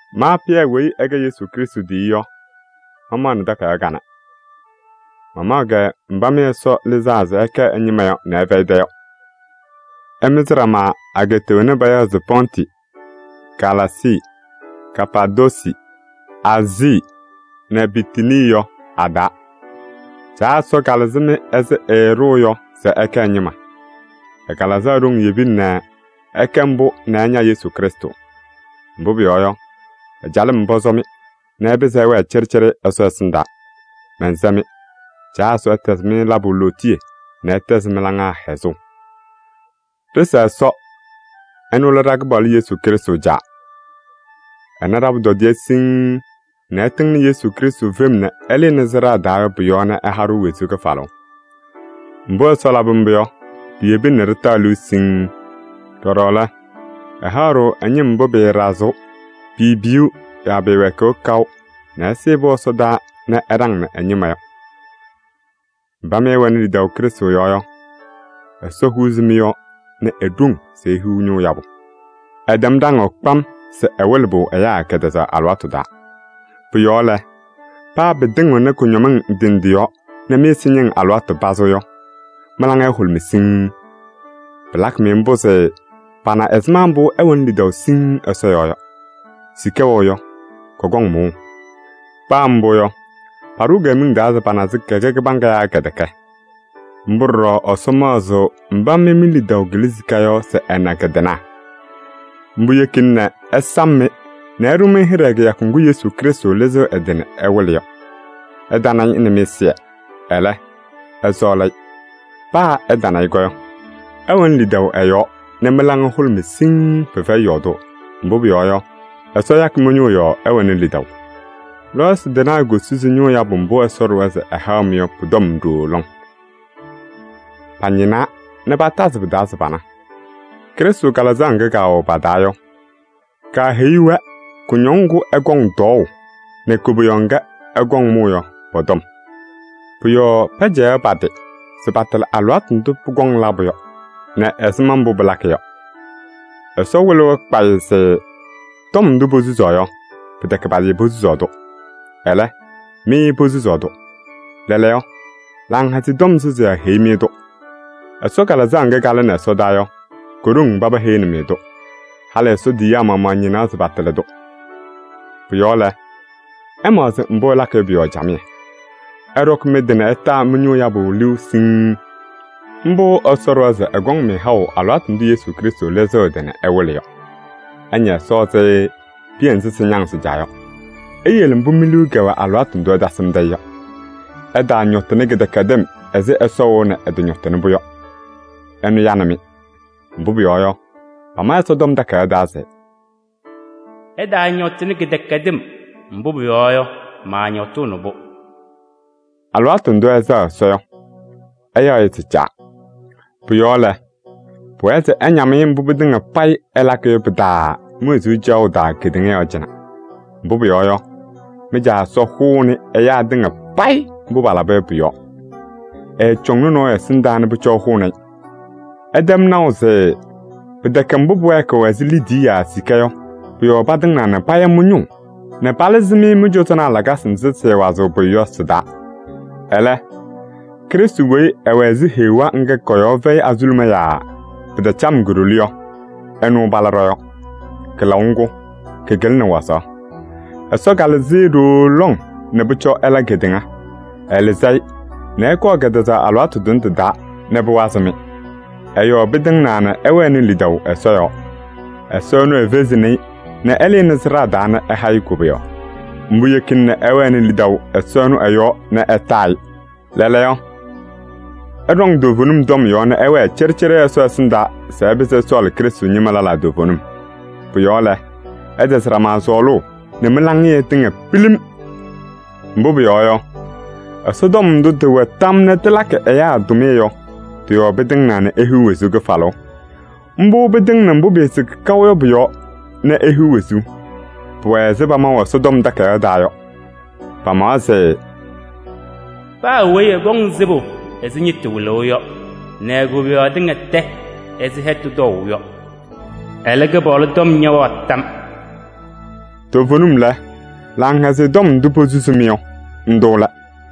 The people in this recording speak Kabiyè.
Ma Pɩyɛ weyi ɛkɛ Yesu Krɩstʋ tiyiyu yɔ, mamaɣnɩ takayaɣ kanɛ. Mamaɣ-kɛ mba mɩ Ɛsɔ lɩzaa se ɩkɛ ɛ-ñɩma nɛ ɩfɛyɩ mɩ-tɛ yɔ. Ɩmɩzɩ ɖama ageeta wena payaɣ se Pɔntɩ nɛ Galaasii nɛ Kapaadoosi nɛ Aazii nɛ Bitinii yɔ a-taa. Caa Ɛsɔ kalɩzɩ-mɩ ɛzɩ ɛɛɖʋʋ yɔ se ɩkɛ ɛ-ñɩma. Ɛ-Kalɩzaɣ ɖoŋ yebina nɛ ɩkɛ mbʋ nɛ ɩña Yesu Krɩstʋ. Mbʋ pʋyɔɔ yɔ, ɛ-calɩm pɔsɔ-mɩ se ɩpɩzɩ ɩwɛɛ cɩɖɩcɩɖɩ Ɛsɔ ɛsɩndaa. Mɛnsɛ-mɩ: Caa Ɛsɔ ɛtɛzɩ-mɩ labʋ lootiye nɛ ɛtɛzɩ mɩ-laŋa hɛzʋʋ. Ɖɩsa Ɛsɔ, ɛnʋ lɛ ɖa-Kɩpaɣlʋ Yesu Krɩstʋ Caa. Ɛna ɖa-pʋtɔdɩyɛ siŋŋ nɛ ɛtɩŋnɩ Yesu Krɩstʋ fem nɛ ɛlɩnɩ sɩɖaa taa yɔ pʋ-yɔɔ nɛ ɛha-ɖʋ wezuu kɩfalʋʋ. Mbʋ Ɛsɔ labɩ mbʋ yɔ, piyebina nɛ ɖɩtaɣ liu siŋŋ. Ɖɔɖɔ lɛ, ɛhaɣ-ɖʋ ɛ-ñɩm mbʋ pɩɩɖazɩɣ yaa piipiyiɣ yaa pɩɩwɛɛkɩɣ kaʋ nɛ ɛsɩɩ-pʋ ɛsɔdaa nɛ ɛɖaŋnɩ ɛ-ñɩma yɔ. Mba mɩ ɩwɛnɩ lidaʋ Krɩstʋ yɔɔ yɔ, Ɛsɔ huuzi mɩ-yɔɔ nɛ e-ɖoŋ se ihiɣ ñʋʋ yabʋ. Ɛtɛm ɖaŋʋʋ kpam se ɛwɩlɩ-pʋ ɛyaa kɛtɛzaɣ alɩwaatʋ taa. Pʋ-yɔɔ lɛ, paa pɩtɩŋɩɣnɩ kʋñɔmɩŋ ndɩ ndɩ yɔɔ nɛ mɩ-ɛza ñɩŋ alɩwaatʋ pazɩ yɔ, mɩ-laŋa ɛhʋlʋmɩ siŋŋ. Pɩlakɩ-mɩ mbʋ se pana ɛzɩma mbʋ ɩwɛnɩ lidaʋ siŋŋ Ɛsɔ yɔɔ yɔ. Sika wɛʋ yɔ, kɔkɔŋ mʋʋʋ. Paa mbʋ yɔ, paɖʋʋ-kɛ miŋ taa se pana se kɛkɛ kɩbaŋga naa kɛtɛkɛ. Mbʋ ɖɔɖɔ Ɛsɔ maɣzɩɣ mba mɩ mi-lidaʋ kɩlɩ sika wazaɣ yɔ se ɛna kɩ-tɩnaɣ. Mbʋ yekina nɛ ɛsam-mɩ nɛ ɛɖʋ-mɩ hɩɖɛ kɩyakʋ ŋgʋ Yesu Krɩstʋ lɩzɩɣ ɛ-tɩ nɛ ɛwɩlɩ yɔ. Ɩtana-ɩ nɛ mɩ-ɛzɩyɛ, ɛlɛ ɩsɔɔlɩ-ɩ. Paa ɩtana-ɩ yɔ, ɩwɛnɩ lidaʋ ɛ-yɔɔ nɛ mɩ-laŋa hʋlʋmɩ siŋŋ, pɩfɛyɩ yɔɔdʋʋ. Mbʋ pʋyɔɔ yɔ, Ɛsɔ yakɩ mɩ-ñʋʋ yɔɔ ɩwɛnɩ lidaʋ. Lɔɔyɩsɩ tɩnaa kosusi ñʋʋ yabʋ mbʋ Ɛsɔ ɖʋwa se ɛhaɣ-mɩ yɔ pʋ-tɔm ɖooo lɔŋ. Pañɩnaa nɛ patazɩ pɩ-taa se pana. Krɩstʋ Kalɩzaɣ ŋga kaawɛ pa-taa yɔ, kaaheyi-wɛ kʋñɔŋ ŋgʋ ɛkɔŋ tɔɔʋ yɔ nɛ koboyaɣ ŋga ɛkɔŋ mʋʋ yɔ pɔ-tɔm. Pʋ-yɔɔ pɛcɛyaɣ pa-tɩ se patɩlɩ alɩwaatʋ ndʋ pʋkɔŋ labʋ yɔ nɛ ɛzɩma mbʋ pɩlakɩ yɔ. Ɛsɔ wɩlɩ-wɛ kpayɩ se tɔm ndʋ posusaɣ yɔ, pɩtɛkɛ pa-tɩ posusaɣ-tʋ. Ɛlɛ, mɩ posusaɣ-tʋ. Lɛɛlɛɛyɔ, Laŋhɛzɩyɛ Tɔm susiyaa heyi-mɩ-tʋ. Ɛsɔ Kalɩzaɣ ŋga kalɩnɩ ɛsɔdaa yɔ, ko-ɖoŋ paba heyini-mɩ-tʋ. Halɩ Ɛsɔ tiyiyaa maɣmaɣ ñɩnaɣ se patɩlɩ-tʋ. Pʋ-yɔɔ lɛ, ɩmaɣzɩ mbʋ ɩlakɩ yɔ pʋ-yɔɔ camɩyɛ. Ɩɖɔkɩ mɩ-tɩ nɛ ɩtaa mɩ-ñʋʋ yabʋ liu siŋŋ. Mbʋ Ɛsɔ ɖʋwa se ɛkɔŋ-mɩ haʋ alɩwaatʋ ndʋ Yesu Krɩstʋ lɩzɩɣ ɛ-tɩ nɛ ɛwɩlɩ yɔ. Ɩña Ɛsɔ ɛzɩ piya nzɩ sɩñaŋ sɩ-caa yɔ. Iyele mbʋ mi-liu kɛwɛ alɩwaatʋ ndʋ ɩtasɩmdɩ-ɩ yɔ. Ɩtaañɔtɩnɩ kɩdɛkɛdɩm ɛzɩ Ɛsɔ wɛʋ nɛ ɛtɔñɔtɩnɩ-pʋ yɔ. Ɛnʋ yanɩ-mɩ. Mbʋ pʋyɔɔ yɔ, pama Ɛsɔtɔm Takayaɣ taa se: “Ɩtaañɔtɩnɩ kɩdɛkɛdɩm, mbʋ pʋyɔɔ yɔ, maañɔtʋʋnɩ-pʋ.” Alɩwaatʋ ndʋ ɩsɛɣ Ɛsɔ yɔ, ɩyaɣ-ɩ se Caa. Pʋ-yɔɔ lɛ, pʋwɛɛ se ɩñam-ɩ mbʋ pɩtɩŋa payɩ ɩlakɩ yɔ pɩ-taa mi-wezuu caɣʋ taa kedeŋa yɔɔ cɩnɛ. Mbʋ pʋyɔɔ yɔ, mɩ-Caa Ɛsɔ hʋʋnɩ ɛyaa tɩŋa payɩ mbʋ palaba yɔ pʋ-yɔɔ. Ɛɛcɔŋnɩ nɔɔyʋ ɛsɩndaa nɛ pʋcɔ ɛhʋnɩ-ɩ. Ɩtɛm naʋ se pɩtɛkɛ mbʋ pʋwɛɛkɩɣ ɛzɩ liidiye yaa sika yɔ pʋ-yɔɔ patɩŋnaa nɛ paya mɩ-ñʋʋ nɛ palɩzɩ-mɩ mɩ-cɔzɔnaa lakasɩ nzɩ sɩɩwazɩɣ pʋyʋ yɔ sɩ-taa. Ɛlɛ, Krɩstʋ weyi ɛwɛ ɛzɩ heɣa ŋga kɔ-yɔɔ fɛyɩ azuluma yaa pɩtacam ko-ɖoli yɔ, ɛnʋ pala ɖɔ-yɔɔ. Kɩlaʋ ŋgʋ kɩkɩlɩnɩ wazaɣ. Ɛsɔ kalɩzɩ-ɩ ɖooo lɔŋ nɛ pʋcɔ ɛla kedeŋa. Ɛlɩzɩ-ɩ nɛ ɛkɔɔ kɛtɛzaɣ alɩwaatʋ tʋnɛ tɩ-taa nɛ pʋwazɩ-mɩ. Ɛ-yɔɔ pɩtɩŋnaa nɛ ɩwɛnɩ lidaʋ Ɛsɔ yɔɔ. Ɛsɔ ɛnʋ efezini-i nɛ ɛlɩnɩ sɩɖaa taa nɛ ɛha-ɩ koboyaɣ. Mbʋ yekina nɛ ɩwɛnɩ lidaʋ Ɛsɔ ɛnʋ ɛ-yɔɔ nɛ ɩtaa-ɩ. Lɛɛlɛɛyɔ, ɩɖɔŋ toovenim tɔm yɔɔ nɛ ɩwɛɛ cɩɖɩcɩɖɩ Ɛsɔ ɛsɩndaa se ɩpɩzɩ ɩsɔɔlɩ Krɩstʋ ñɩma lɛlaa toovenim. Pʋ-yɔɔ lɛ, ɩtɛzɩ ɖama sɔɔlʋʋ nɛ mɩ-laŋɩyɛ tɩŋa pilim. Mbʋ pʋyɔɔ yɔ, Ɛsɔtɔm ndʋ tɩwɛ tam nɛ tɩlakɩ ɛyaa tʋmɩyɛ yɔ, tɩ-yɔɔ pɩtɩŋnaa nɛ ihiɣ wezuu kɩfalʋʋ. Mbʋ pɩtɩŋnɩ mbʋ pɩɩsɩkɩ kaʋ yɔ pʋ-yɔɔ nɛ ihiɣ wezuu. Pʋwɛ ɛzɩ pamaʋ Ɛsɔtɔm Takayaɣ taa yɔ. Pamawa se: “Paa weyi ɛkɔŋ sɩbʋ ɛzɩ ñɩtʋ wɩlʋʋ yɔ nɛ e-koboyaɣ tɩŋa tɛ ɛzɩ hɛtʋ tɔʋʋ yɔ. Ɛlɛ, Kɩpaɣlʋ tɔm ñɛwɛɣ tam.” Toovenim lɛ, Laŋhɛzɩyɛ Tɔm ndʋ posusi-mɩ yɔ, ndʋ lɛ.